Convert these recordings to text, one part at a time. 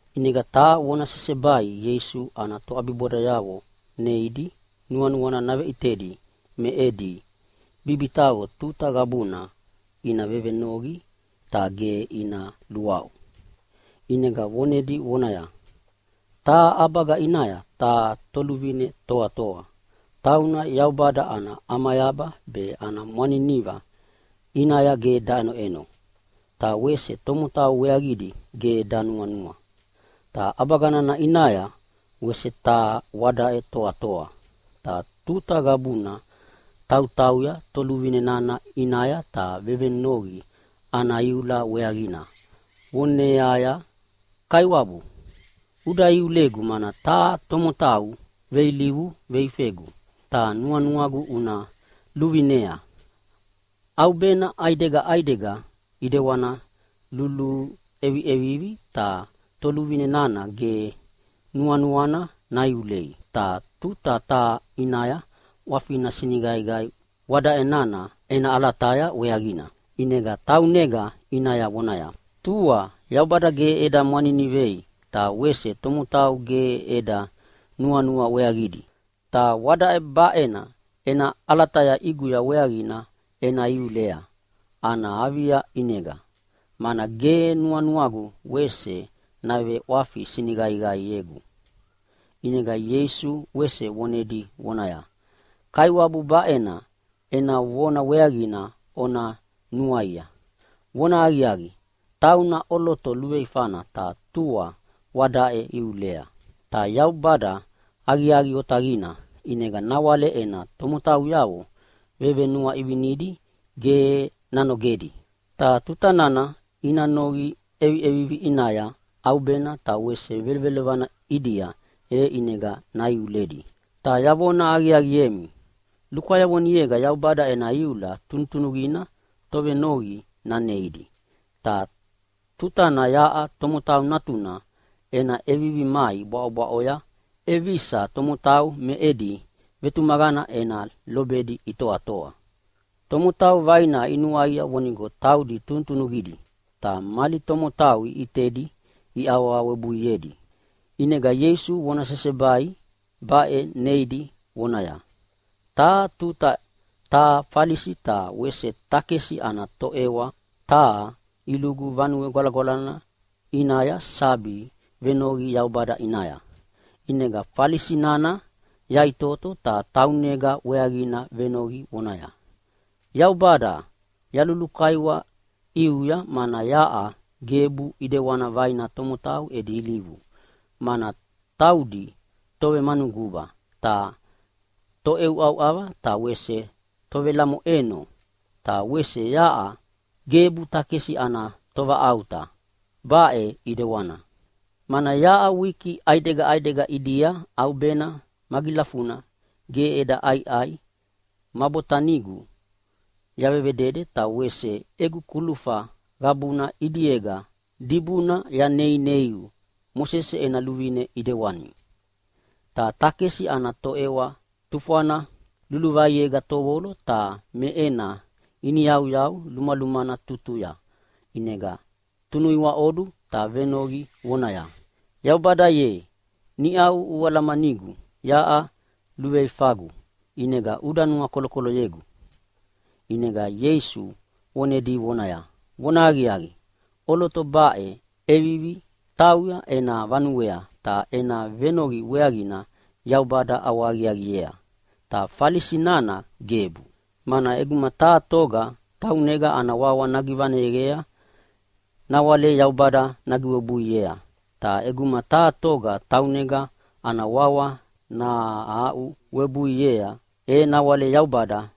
ʼInega taha vona sesebai Ieisu ana toʼabibodayavo neidi nuanuana naveʼitedi me edi bibitaqo tuta qabuna ina vevenoqi ta ge ina luaʼu. ʼInega vonedi vonaya, “Taha ʼabaga ʼinaya taha toluvine toatoa, tauna Yaubada ana ʼamayaba be ana mwaniniva ʼinaya ge daʼenoʼeno, ta wese tomotau weaqidi ge danuanua. “Ta ʼabaga nana ʼinaya wese taha wadaʼe toatoa, ta tuta qabuna tautauya toluvine nana ʼinaya ta vevenoqi ana iula weaqina vonevoneaya, ‘Kaiwabu, uda iulegu mana taha tomotau veilivu veifegu, ta nuanuagu una luvinea.’ “ʼAubena ʼaidega ʼaidega ʼedewana luluʼeviʼevivi ta toluvine nana ge nuanuana naiulei. Ta taha tuta ʼinaya ʼwafina siniqaiqai wadaʼe ena ʼalataya weaqina, ʼinega taunega ʼinaya vonaya, ‘Tua Yaubada ge eda mwaninivei ta wese tomotau ge eda nuanua weaqidi, ta wadaʼe baʼe ena ʼalataya ʼiguya weaqina ena iulea ana avia ʼinega, mana ge nuanuagu wese naveʼwafi siniqaiqaiegu!’” ʼInega Ieisu wese vonedi vonaya, “Kaiwabu baʼe ena vona weaqina ona nuaia. Vonahaqiaqi, tauna ʼoloto luveifana ta tua wadaʼe iulea. Ta Yaubada aqiaqi otaqina, ʼinega nawale ena tomotauyavo vevenuaʼivinidi ge nanogedi. Ta tutana ina noqi ʼeviʼevivi ʼinaya ʼaubena ta wese velovelovana ʼidia e ʼinega naiuledi. Ta yavona aqiaqiemi, lukwayavonega Yaubada ena iula tunutunuqina tovenoqi naneidi. Ta tutana yaʼa Tomotau Natuna ena ʼevivi mai bwaʼobwaʼoya ʼevisa tomotau me edi vetumaqana ena lobedi itoatoa?” Tomotau vaina inuaia vonigo taudi tunutunuqidi, ta mali tomotau iʼitedi iawawebuiedi, ʼinega Ieisu vona sesebai baʼe neidi vonaya, “Taha tuta taha Falisi ta wese takesi ana toʼewa taha ilugu Vanue Gwalagwalana ʼinaya sabi venoqi Yaubada ʼinaya. ʼInega Falisi nana yaʼitoto ta taunega weaqina venoqi vonaya, ‘Yaubada, yalulukaiwa ʼiuya mana yaʼa gebu ʼedewana vaina tomotau edi ilivu, mana taudi tovemanuguba ta toʼeuʼauʼava ta wese tovelamoʼeno, ta wese yaʼa gebu takesi ana tovaʼauta baʼe ʼidewana. Mana yaʼa wiki ʼaidega ʼaidega ʼidia ʼaubena magilafuna ge eda ʼaiʼai ma botanigu yavevedede ta wese egu kulufa qabuna ʼidiega dibuna yaneineiu Mosese ena luvine ʼidewani.’ “Ta takesi ana toʼewa tufwana luluvaiega tovolo ta me ena iniyauyau lumalumana tutuya ʼinega tunuiwaʼodu ta venoqi vonaya, ‘Yaubada ye, niʼau ualamanigu yaʼa luveifagu ʼinega uda nuakolokoloyegu.’” ʼInega Ieisu vonedi vonaya, “Vonahaqiaqi, ʼoloto baʼe ʼevivi tauya ena vanuea, ta ena venoqi weaqina Yaubada ʼawahaqiaqiea, ta Falisi nana gebu. Mana ʼeguma taha toga taunega ana wawa nagivaneyea nawale Yaubada nagiwebuiea, ta ʼeguma taha toga taunega ana wawa nahaʼuwebuiea e nawale Yaubada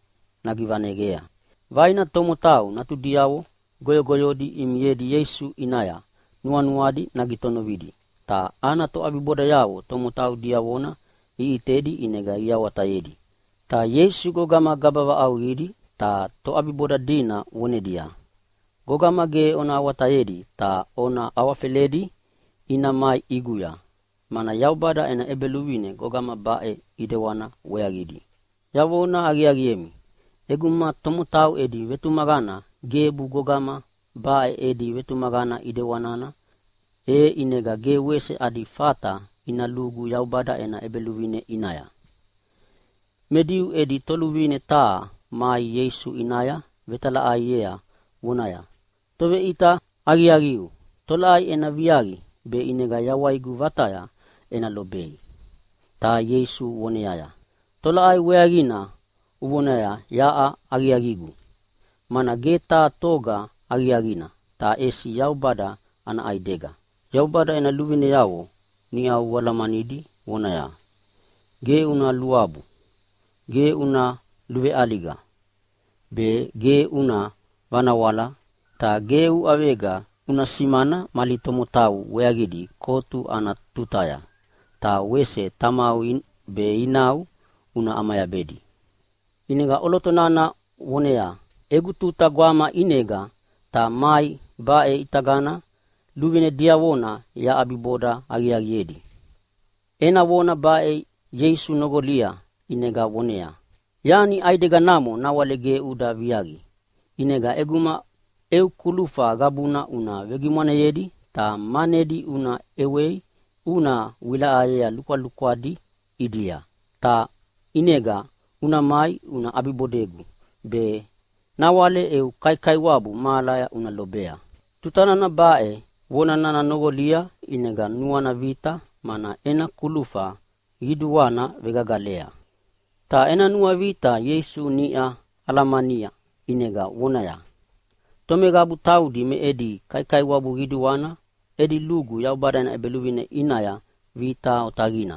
nagivaneyea.” Vaina tomotau natudiavo goyogoyodi imiedi Ieisu ʼinaya nuanuadi nagitonovidi, ta ana toʼabibodayavo tomotau diavona iʼitedi ʼinega iawatayedi. Ta Ieisu gogama gaba vaʼauqidi ta toʼabiboda dina vonedia, “Gogama ge ona awatayedi ta ona awafeledi ina mai ʼiguya. Mana Yaubada ena ʼEbeluvine gogama baʼe ʼidewana weaqidi. Yavona aqiaqiemi, ʼeguma tomotau edi vetumaqana gebu gogama baʼe edi vetumaqana ʼedewanina, e ʼinega ge wese adi fata ina lugu Yaubada ena ʼEbeluvine ʼinaya!” Me Diu edi toluvine taha mai Ieisu ʼinaya vetalaʼaiea vonaya, “Toveʼita aqiaqiu, tolaʼai ena viaqi be ʼinega yawaigu vataya ena lobei?” Ta Ieisu voneaya, “Tolaʼai weaqina uvonaya yaʼa aqiaqigu? Mana ge taha toga aqiaqina, ta ʼesi Yaubada ana ʼaidega. Yaubada ena luvineavo niʼau ualamanidi, vonaya, ‘Ge una luabu, ge una luveʼaliga be, ge una vanawala, ta ge uʼavega una simana mali tomotau weaqidi kotu ana tutaya’, ta wese, ‘Tamau be inau una ʼamayabedi.’” ʼInega ʼoloto nana voneaya, “Egu tuta gwama ʼinega ta mai baʼe ʼitagana luvine diavona yaʼabiboda aqiaqiedi.” Ena vona baʼe Ieisu noqolia ʼinega voneaya, “Yani ʼaideganamo nawale ge uda viaqia, ʼinega ʼeguma eu kulufa qabuna una vegimwaneyedi ta manedi una ʼewei una vewilaʼayea lukwalukwa ʼidia, ta ʼinega una mai una ʼabibodegu be nawale eu kaikaiwabu mahalaya una lobea.” Tutana baʼe vona nana noqolia, ʼinega nuana vita, mana ena kulufa qiduana vegagalea. Ta ena nuavita Ieisu niʼa alamania ʼinega vonaya, “Tomeqabu taudi me edi kaikaiwabu qiduana edi lugu Yaubada ena ʼEbeluvine ʼinaya vita otaqina.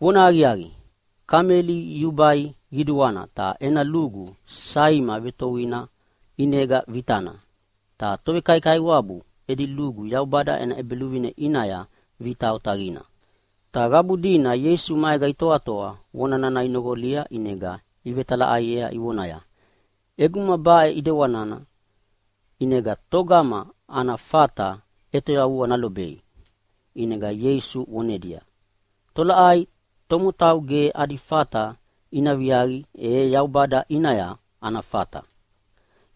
Vonahaqiaqi, kameli yubai qiduana ta ena lugu saima vetoana ʼinega vitana. Ta tovekaikaiwabu edi lugu Yaubada ena ʼEbeluvine ʼinaya vita otaqina.” Ta qabu dina Ieisu maega itoatoa vona nana inoqolia ʼinega ivetalaʼaiea ivonaya, “ʼEguma baʼe ʼedewanina, ʼinega togama ana fata ʼetoyavua nalobei?” ʼInega Ieisu vonedia, “Tolaʼai tomotau ge adi fata ina viaqi, e Yaubada ʼinaya ana fata!” Ta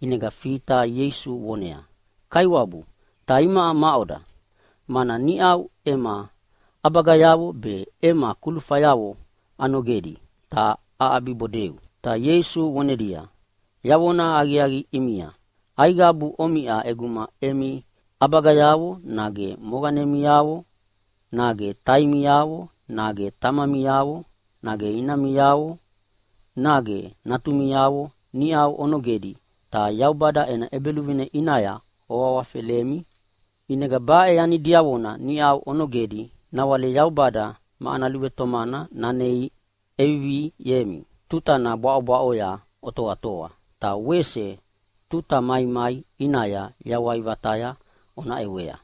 ʼinega Fita Ieisu voneaya, “Kaiwabu, ta imaʼa maʼoda? Mana niʼau ema ʼabagayavo be ema kulufayavo anogedi ta aʼabibodeu.” Ta Ieisu vonedia, “Yavonahaqiaqi ʼimia, aiqabu omiʼa ʼeguma emi ʼabagayavo nage moqanemiavo nage taimiavo nage tamamiavo nage inamiavo nage natumiavo niʼa onogedi ta Yaubada ena ʼEbeluvine ʼinaya oawafelemi, ʼinega baʼe yani diavona niʼau onogedi nawale Yaubada ma ana luvetomana nanei ʼeviviemi tutana bwaʼobwaʼoya otoatoa, ta wese tuta maimai ʼinaya yawai vataya ona ʼewea.”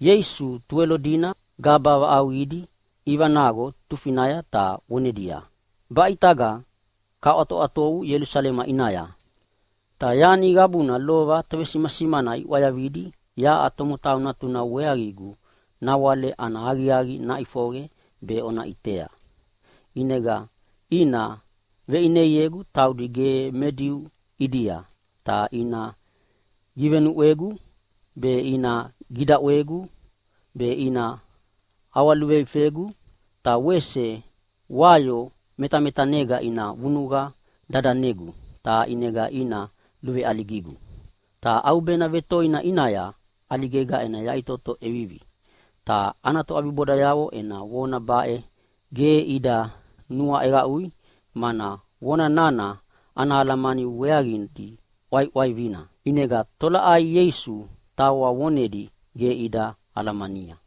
Ieisu Tuwelo dina gaba vaʼauqidi ivanaqo tufinaya ta vonedia, “Baʼe ʼitaga kaʼwatoʼwatovu Ielusalema ʼinaya, ta yani qabuna lova tovesimasimana iʼwayavidi yaʼa Tomotau Natuna weaqigu nawale ana aqiaqi naʼifoqe be ona ʼitea. ʼInega ina veʼineiegu taudi ge me Diu ʼidia, ta ina givenuʼwegu be ina gidaʼwegu be ina ʼawaluveifegu, ta wese wayo metametanega ina vunuqa dadanegu ta ʼinega ina luveʼaligigu. Ta ʼaubena vetoina ʼinaya ʼaligega ena yaʼitoto ʼevivi.” Ta ana toʼabibodayavo ena vona baʼe ge ida nuaʼeqaʼui, mana vona nana ana alamani weaqidi ʼwaiʼwaivina. ʼInega tolaʼai Ieisu tawa vonedi ge ida alamania.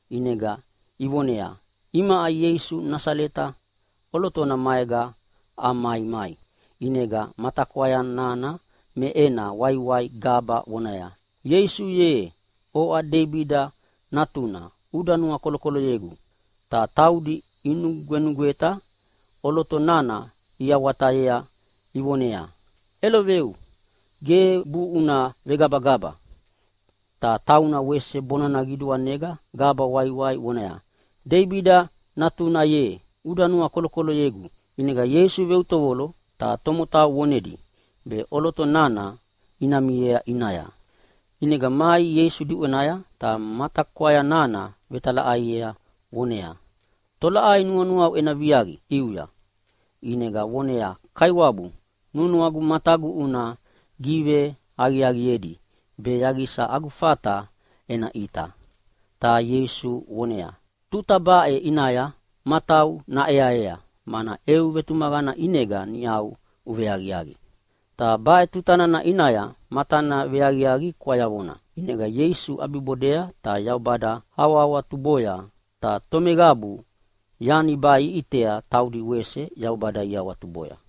ʼInega ivoneaya, “Imaʼa Ieisu Nasaleta ʼolotona maega amaimai.” ʼInega matakwaya nana me ena waiwai gaba vonaya, “Ieisu ye, oʼa Deibida natuna uda nuakolokoloyegu!” Ta taudi inugwenugweta ʼoloto nana iawatayea ivoneaya, “ʼEloveu, gebu una vegabagaba!” Ta tauna wese bonana qiduanega gaba waiwai vonaya, “Deibida natuna ye, uda nuakolokoloyegu!” ʼInega Ieisu veutovolo ta tomotau vonedi be ʼoloto nana ina miea ʼinaya. ʼInega mai Ieisu diʼwenaya ta matakwaya nana vetalaʼaiea voneaya, “Tolaʼai nuanuau ena viaqi ʼiuya?” ʼInega voneaya, “Kaiwabu, nuanuagu matagu una giveaqiaqiedi be yaqisa agu fata ena ʼita.” Ta Ieisu voneaya, “Tuta baʼe ʼinaya matau naʼeaea, mana eu vetumaqana ʼinega niʼa uveaqiaqi.” Ta baʼe tuta nana ʼinaya matana veaqiaqi kwayavona. ʼInega Ieisu ʼabibodea ta Yaubada awahawatuboya. Ta tomeqabu yani baʼe iʼitea taudi wese Yaubada iawatuboya.